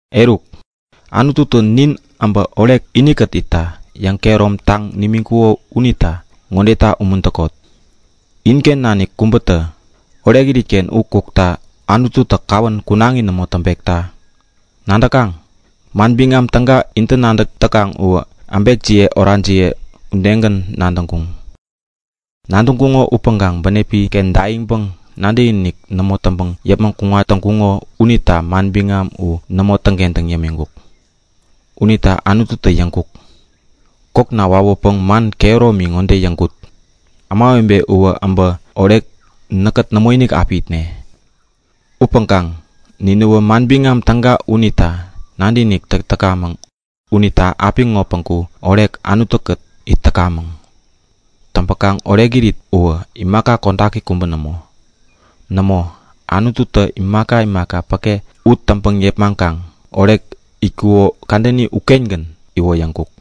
Eruk, Anututä nin äbä orek inikät itta yäŋkehäromtaŋ nimiŋkuko unita ŋodeta umuntäkot; Inken nanik kubätä orekirit-ken u kukta Anututä kawän kunaŋi nämo täŋpekta! Nadäkaŋ? Manbiŋam Täga intä nadäk täkaŋ u äbekjiye orajiye udegän nadäŋkuŋ. Nadäŋkuŋo upäŋkaŋ bänepi-ken daiŋpäŋ nadäkinik nämo täŋpäŋ yäpmäŋ kuŋat täŋkuŋo unita manbiŋam u nämo täŋkentäŋ yämiŋkuk. Unita Anututä yäŋkuk; Kokna wawäpäŋ man kehäromi ŋode yäŋkut; Ämawebe uwä äbä orek näkkät nämoinik api itne. Upäŋkaŋ ninäwä Manbiŋam Täga unita nadäkinik täk täkamäŋ unita apiŋo päŋku orek Anutu-kät it täkamäŋ. Täŋpäkaŋ orekirit uwä imaka kodaki kubä nämo. Nämo, Anututä imaka imaka päke u täŋpäŋ yepmaŋkaŋ orek itkuko kadäni ukengän iwoyäŋkuk.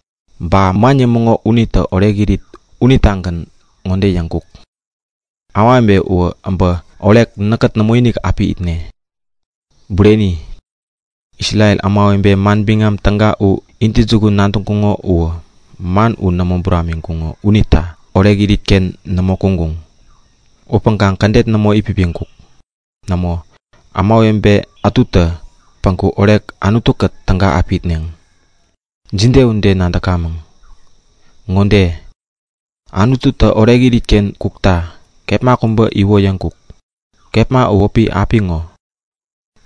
Ba man yämäŋo unitä orekirit unitagän ŋode yäŋkuk; Ämawebe uwä äbä orek näkkät nämoinik api itne. Bureni, Isrel ämawebe Manbiŋam Täga u intäjukun nadäŋkuŋo upäŋkaŋ man u nämo buramiŋkuŋo unita orekirit-ken nämo kuŋkuŋ. Upäŋkaŋ kädet nämo itpipiŋkuk. Nämo, ämawebe ätutä päŋku orek Anutu-kät täga api itneŋ. Jide ude nadäkamäŋ? Ŋode; Anututä orekirit uken kukta kepma kubä iwoyäŋkuk. Kepma u wäpi apiŋo.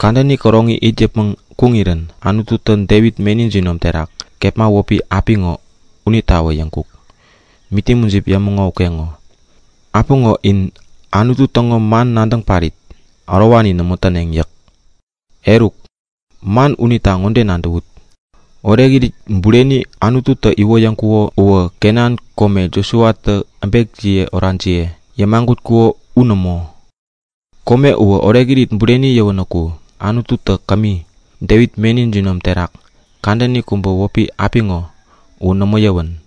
Kadäni käroŋi it yäpmäŋ kuŋirän Anututä Devit meni jinom terak kepma wäpi “apiŋo” unitawä yäŋkuk. Miti mujip yämäŋo ukeŋo; Apiŋo in Anutu täŋo man nadäŋ parit ärowani nämo täneŋ yäk. Eruk, man unita ŋode nadäwut; Orekirit bureni Anututä iwoyäŋkuko uwä Kenan kome Josuatä äbekjiye orajiye yämagutkuko u nämo. Kome uwä orekirit bureni yäwänäku Anututä kämi, Devit meni jinom terak kadäni kubä wäpi “apiŋo” u nämo yäwän.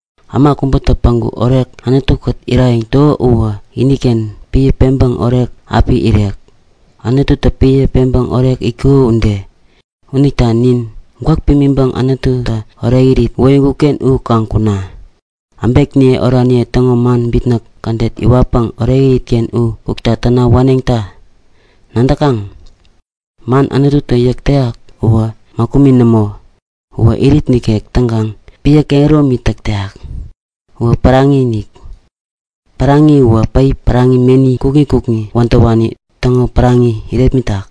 Äma kubätä päŋku orek Anutu-kät irayäŋ täko uwä iniken piä peŋpäŋ orek api irek, Anututä piä peŋpäŋ orek itkuko ude. Unita ninä gwäk pimiŋpäŋ Anututä orekirit iwoyäŋkuk-ken u kaŋ kuna! Äbekniye oraniye täŋo man bitnäk kädet iwatpäŋ orekirit-ken u kukta täna waneŋta! Nadäkaŋ? Man Anututä yäk täyak uwä mäkumi nämo. Uwä irit ikek täŋkaŋ piä kehäromi täk täyak. Uwä päraŋi-inik. Päraŋini uwä päip päraŋi, meni kukŋi kukŋi wädäwani täŋo päraŋini yärepmitak.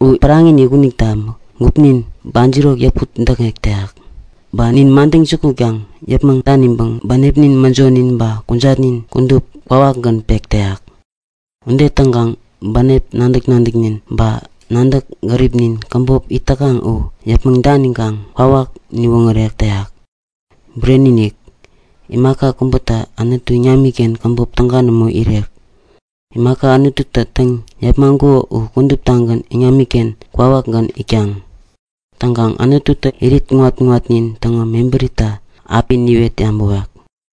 U päraŋi-inik unita gupnin bajirok yäput-däkŋek täyak. Ba nin madäŋ jukutkaŋ yäpmäŋ daniŋpäŋ bänepnin, mäjonin ba kujatnin kudup kwawakgän pek täyak. Ude täŋkaŋ bänep nadäk-nadäknin ba nadäŋ gäripnin käbop it täkaŋ u yäpmäŋ daniŋkaŋ kwawak niwoŋärek täyak. Bureni-inik! Imaka kubätä Anutu iŋamiken käbop täga nämo irek. Imaka Anututä täŋ-yepmaŋkuko u kuduptagän iŋamiken kwawakinik itkaŋ. Täŋkaŋ Anututä nin kudup, irit kuŋat-kuŋatnin täŋo mebärita api niwet yabäwek.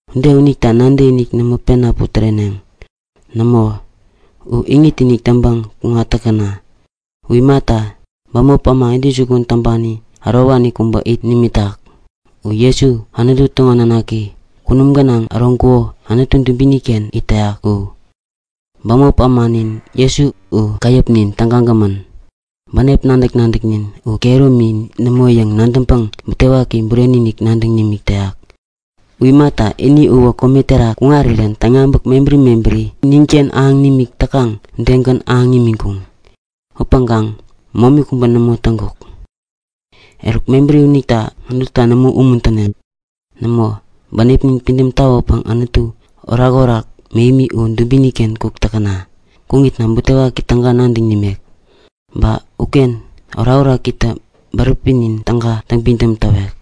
Ude unita nadäkiniknin nämo pena putäreneŋ. Nämo, u iŋit-inik täŋpäŋ kuŋat täkäna! U imata, bämop äma intäjukun täŋpani ärowani kubä it nimitak. U Jesu, Anutu täŋo nanaki, kunum gänaŋ äroŋkuko Anutu dubini-ken it täyak u. Bämop ämanin Jesu u käyäpnin tägagämän. Bänep nadäk-nadäknin u kehäromi nämo yäŋ nadäŋpäŋ butewaki bureni-inik nadäŋ nimik täyak. U imata, ini uwä kome terak kuŋarirän täŋyabäk mebäri mebäri ninken ahäŋ nimik täkaŋ udegän ahäŋ imiŋkuŋ. Upäŋkaŋ momi kubä nämo täŋkuk. Eruk, mebäri unita Anututa nämo umuntäne. Nämo, bänepnin pidäm tawäpäŋ Anutu orakorak mähemi u dubini-ken kuk täkäna! Kuŋitna butewaki täga nadäŋ nimek. Ba uken orakorakitä bäräpinin täga täŋpidäm tawek.